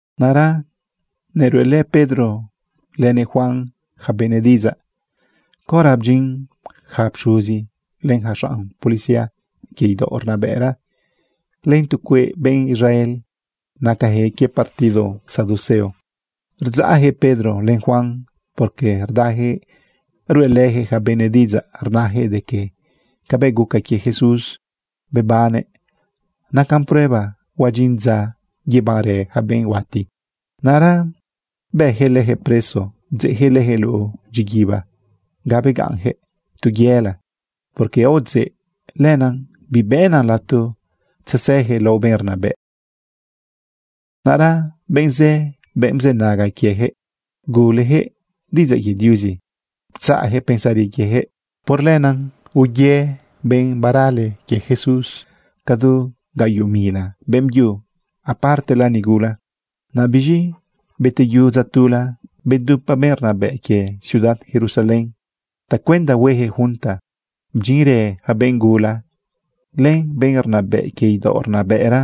Naꞌra neruꞌelë Pedro lënëꞌ Juan yaca benëꞌ diꞌidzaꞌ caora bdyin yaca pxuzi, len yaca xanꞌ policía quie idaoꞌ rnabëꞌra, len tu cueꞌ benꞌ Israel nacajëꞌ quie partido saduceo. Rdzaꞌyaquëꞌ Pedro len Juan porque rdayaquëꞌ ruꞌelëyaquëꞌ yaca benëꞌ diꞌidzaꞌ rnayaquëꞌ de que cabëꞌ guca quie Jesús bebannëꞌ nacan prueba huadyin dza yebanrë yaca benꞌ huati. Naꞌra bëyaquëꞌ leyaquëꞌ preso, bdzeꞌyaquëꞌ leyaquëꞌ luꞌu dyiguiba ga begaꞌnyaquëꞌ tu yela porque aodzeꞌ. Lenaꞌ bibëꞌnan lato tzesëyaquëꞌ lao benꞌ rnabëꞌ. Naꞌra benꞌ zë, benꞌ bzënaga quiejëꞌ, guleyaquëꞌ diꞌidzaꞌ quie Diuzi, ptzaꞌyaquëꞌ pensari quieyaquëꞌ. Por lenaꞌ uye benꞌ barale quie Jesús cadu gaꞌyoꞌ mila beꞌmbyu, apartela nigula. Naꞌ biz̃i beteyu dza tula, bedupa benꞌ rnabëꞌ quie ciudad Jerusalén tacuenda hueyaquëꞌ junta. Bdyinrë yaca benꞌ gula, len benꞌ rnabëꞌ quie idaoꞌ rnabëꞌra,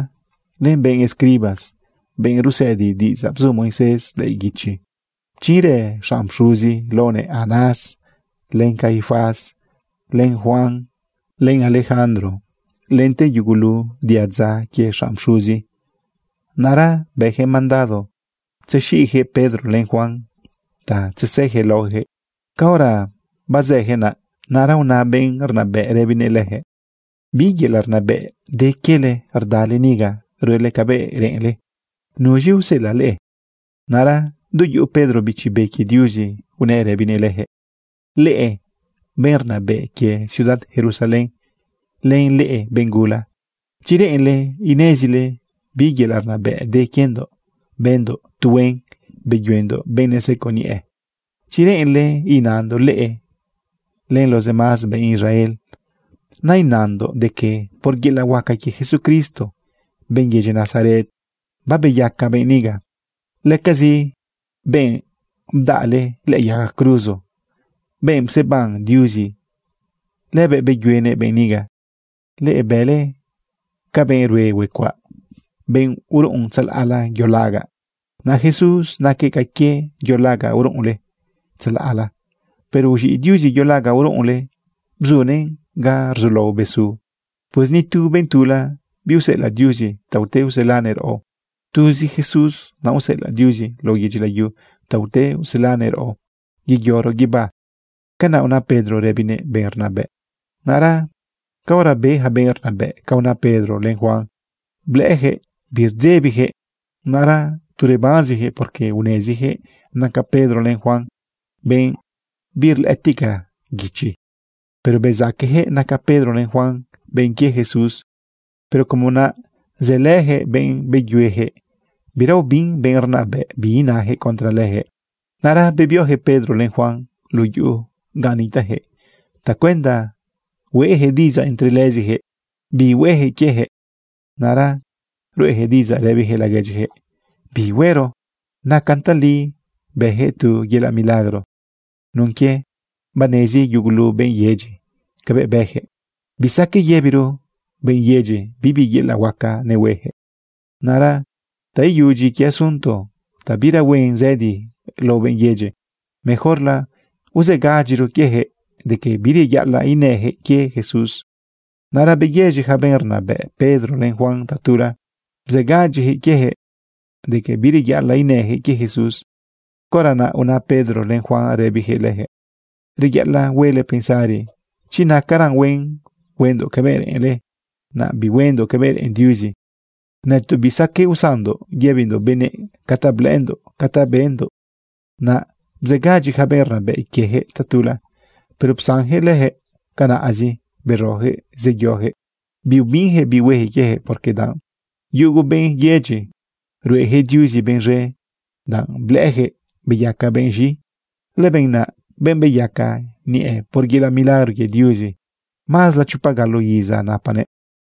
len benꞌ escribas, benꞌ rusëdi diꞌidzaꞌ bzu Moisés lëꞌë guichi. Bdyinrë xanꞌ pxuzi laonëꞌ Anás, len Caifás, len Juan, len Alejandro, lente yugulu diadza quie xanꞌ pxuzi. Naꞌra bëyaquëꞌ mandado tzexiꞌjëꞌ Pedro len Juan ta tzesëjëꞌ laojëꞌ. Caora bazëyaquëꞌ naꞌ, naꞌra una benꞌ rnabëꞌ rëbinëꞌ leyaquëꞌ: ―¿Bi yelaꞌ rnabëꞌ de quiele rdale niga ruele cabëꞌ reꞌenle? ¿Nuz̃i useꞌelaꞌ leꞌe? Naꞌra du yuꞌu Pedro Bichi Be quie Diuzi, unëꞌ rëbinëꞌ leyaquëꞌ: ―Leꞌe benꞌ rnabëꞌ quie ciudad Jerusalén, len leꞌe benꞌ gula, chi reꞌenle inezile bi yelaꞌ rnabëꞌ de quiendoꞌ bëndoꞌ tu huen beyuendoꞌ benꞌ neseco niꞌe, chi reꞌenle inandoꞌ leꞌe len lo demás benꞌ Israel, nainandoꞌ de que por yelaꞌ huaca quie Jesucristo, benꞌ yedyi Nazaret, babeyaca benꞌ niga. Lëcazi benꞌ bdaꞌle lëꞌë yaga cruzo, benꞌ pseban Diuzi, lëbëꞌ beyuenëꞌ benꞌ niga. Leꞌe bële ca benꞌ rue huecuaꞌ, benꞌ uruꞌun tzalaꞌla yo lagaꞌ. Naꞌ Jesús naquëꞌ ca quie yo lagaꞌ uruꞌunle tzalaꞌla, pero uz̃iꞌ Diuzi yo lagaꞌ uruꞌunle, bzunëꞌn ga rzulao besu. Pues ni tu benꞌ tula biuseꞌelaꞌ Diuzi ta ute uselanëꞌ raꞌo. Tuzi Jesús naꞌ useꞌelaꞌ Diuzi lao yedyi layu ta ute uselanëꞌ raꞌo yeyoro guibá. ―Canaꞌ una Pedro, rëbinëꞌ benꞌ rnabëꞌ. Naꞌra caora be yaca benꞌ rnabëꞌ ca una Pedro len Juan, blëꞌëyaquëꞌ birdzebijëꞌ, naꞌra tu rebanzijëꞌ porque unezijëꞌ naca Pedro len Juan benꞌ birlëꞌëtica guichi. Pero bezaquejëꞌ naca Pedro len Juan benꞌ quie Jesús. Pero como naꞌ zëlëjëꞌ benꞌ beyueyaquëꞌ, bira ubin benꞌ rnabëꞌ bi inayaquëꞌ contra leyaquëꞌ. Naꞌra bebiojëꞌ Pedro len Juan luꞌu yuꞌu gan nitajëꞌ tacuenda hueꞌyaquëꞌ diꞌidzaꞌ entre lëzijëꞌ bi hueyaquëꞌ quieyaquëꞌ. Naꞌra ruꞌeyaquëꞌ diꞌidzaꞌ rëbiyaquëꞌ laguedyiyaquëꞌ: ―¿Bi huero? Nacan tali bëyaquëꞌ tu yelaꞌ milagro. Nun quie banezi yugulu benꞌ yedyi cabëꞌ bëyaquëꞌ, bisaqueꞌ yëbiro benꞌ yedyi bibi yelaꞌ milagro nehueyaquëꞌ. Naꞌra ta iyudyi quie asunto ta bira huen zëdi lao benꞌ yedyi, mejorla uzëgadyiro quiejëꞌ de que bireyaꞌalaꞌ inëyaquëꞌ quie Jesús. Naꞌra beyëz̃i yaca benꞌ rnabëꞌ Pedro len Juan tatula, bzëgadyiyaquëꞌ quiejëꞌ de que bireyaꞌalaꞌ inëyaquëꞌ quie Jesús. Caora naꞌ una Pedro len Juan, rëbiyaquëꞌ leyaquëꞌ: ―Reyaꞌalaꞌ huele pensari chi nacaran huen huendoꞌ cabëꞌ reꞌenle, naꞌ bihuendoꞌ cabëꞌ reꞌen Diuzi. Nëtoꞌ bisaqueꞌ usanndoꞌ yëbindoꞌ benëꞌ ca ta blëꞌëndoꞌ ca ta bendoꞌ. Naꞌ bzëgadyi yaca benꞌ rnabëꞌ quieyaquëꞌ tatula. Pero psanyaquëꞌ leyaquëꞌ canaꞌzi, beroyaquëꞌ zeyoyaquëꞌ. Biubinjëꞌ bi huejëꞌ quiejëꞌ, porque danꞌ yugu benꞌ yedyi rueyaquëꞌ Diuzi benꞌ z̃e, danꞌ blëꞌëyaquëꞌ beyaca benꞌ z̃i. Lëbenꞌ naꞌ, benꞌ beyaca niꞌe por yelaꞌ milagro quie Diuzi, mazla chopa galo iza napanëꞌ.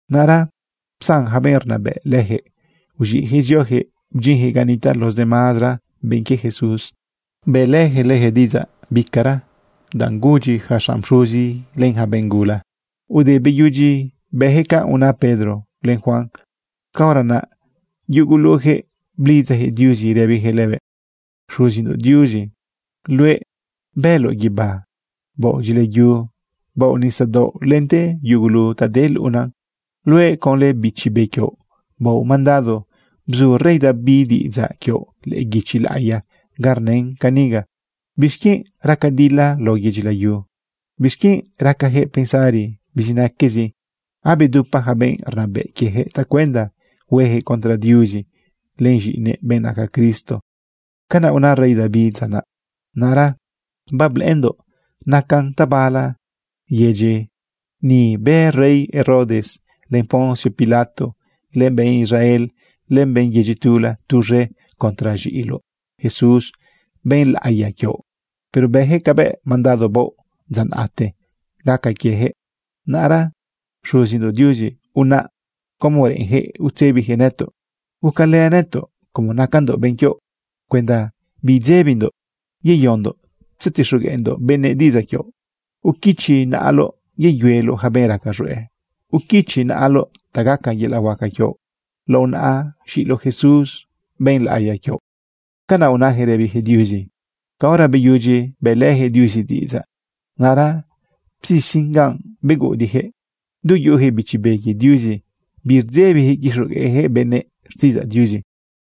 Naꞌra psan yaca benꞌ rnabëꞌ lejëꞌ, uz̃iꞌyaquëꞌ zioyaquëꞌ bdyinyaquëꞌ ga nitaꞌ los demazara benꞌ quie Jesús, bëꞌleyaquëꞌ leyaquëꞌ diꞌidzaꞌ bicara danꞌ gudyi yaca xanꞌ pxuzi len yaca benꞌ gula. Ude beyudyi beyaquëꞌ ca una Pedro len Juan, caora naꞌ yuguluyaquëꞌ blidzayaquëꞌ Diuzi rëbiyaquëꞌ lëbëꞌ: ―Xuzindoꞌ Diuzi, luëꞌ bëloꞌ guibá, baoꞌ dyila yu, baoꞌ nisadaoꞌ lente yugulu ta de luꞌuna. Luëꞌ conlë Bichi Be quioꞌ, baoꞌ mandado bzu rey David diꞌidzaꞌ quioꞌ lëꞌë guichi laꞌiya ga rnën caniga: ¿Bixquienꞌ raca dila lao yedyi layu? ¿Bixquienꞌ racajëꞌ pensari bizinaquezi? Abedupa ja benꞌ rnabëꞌ quieyaquëꞌ tacuenda huejëꞌ contra Diuzi len z̃iꞌinëꞌ, benꞌ naca Cristo. Canaꞌ una rey David dza naꞌ: ―Naꞌra bablëꞌëndoꞌ nacan tabala yedyi ni bë rey Herodes, len Poncio Pilato, len benꞌ Israel, len benꞌ yedyi tula tuz̃e contra z̃iꞌiloꞌ Jesús, benꞌ laꞌiya quioꞌ. Pero bëyaquëꞌ cabëꞌ mandado baoꞌ dza naꞌte gaca quieyaquëꞌ. Naꞌra, Xuzindoꞌ Diuzi, unaꞌ como reꞌenyaquëꞌ utzebiyaquëꞌ nëtoꞌ. Gucalë nëtoꞌ como nacandoꞌ benꞌ quioꞌ cuenda bidzebindoꞌ yeyondoꞌ tzetixogueꞌndoꞌ benëꞌ diꞌidzaꞌ quioꞌ. Uquichoꞌ naꞌaloꞌ yeyueloꞌ yaca benꞌ raca z̃hueꞌ. Uquichoꞌ naꞌaloꞌ ta gaca yelaꞌ huaca quioꞌ lao naꞌa z̃iꞌiloꞌ Jesús, benꞌ laꞌiya quioꞌ. ―Canaꞌ unayaquëꞌ rëbiyaquëꞌ Diuzi. Caora beyudyi bëꞌlëyaquëꞌ Diuzi diꞌidzaꞌ, naꞌra bzisin ganꞌ beguꞌudiꞌyaquëꞌ. Du yuꞌuyaquëꞌ Bichi Be quie Diuzi, birdzebijëꞌ quixogueꞌjëꞌ benëꞌ xtiꞌidzaꞌ Diuzi.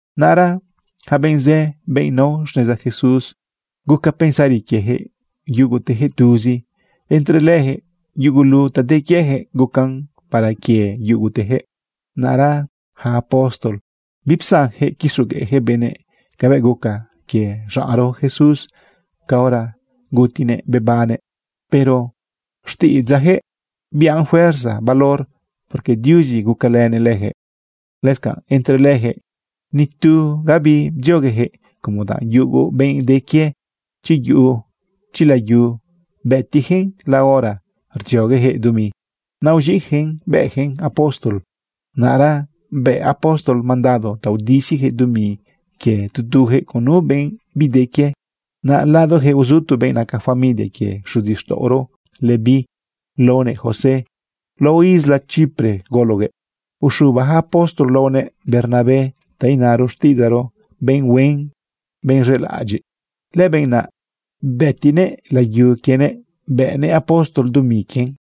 Naꞌra yaca benꞌ zë, benꞌ nao xneza Jesús, guca pensari quiejëꞌ yugutejëꞌ tuzi. Entre leyaquëꞌ, yugulu ta de quieyaquëꞌ, gucan para quie yugutejëꞌ. Naꞌra yaca apóstol bipsanyaquëꞌ quixogueꞌyaquëꞌ benëꞌ cabëꞌ guca quie xaꞌnro Jesús caora gutinëꞌ bebannëꞌ. Pero xtiꞌidzaꞌjëꞌ biꞌan fuerza valor, porque Diuzi gucalënëꞌ leyaquëꞌ. Lëscanꞌ entre leyaquëꞌ, ni tu gabi bdziogueyaquëꞌ, como danꞌ yugo benꞌ de quie, chi yuꞌu, chi layu, bëtiꞌyaquëꞌn la hora rdzioguejëꞌ dumi, naꞌ uz̃iꞌjëꞌn bëꞌjëꞌn apóstol. Naꞌra bë apóstol mandado ta udisiyaquëꞌ dumi quie tu tuyaquëꞌ con nu benꞌ bide quie. Naꞌ ladoyaquëꞌ uzu tu benꞌ naca familia quie xuzixtaꞌoro Leví laonëꞌ José. Lao isla Chipre gologuëꞌ. Uxuba ja apóstol laonëꞌ Bernabé, ta inaro xtiꞌidzaꞌro: Benꞌ huen, benꞌ z̃elaꞌadyiꞌ. Lëbenꞌ naꞌ bëtiꞌnëꞌ layu quienëꞌ bëꞌnëꞌ apóstol dumi quien.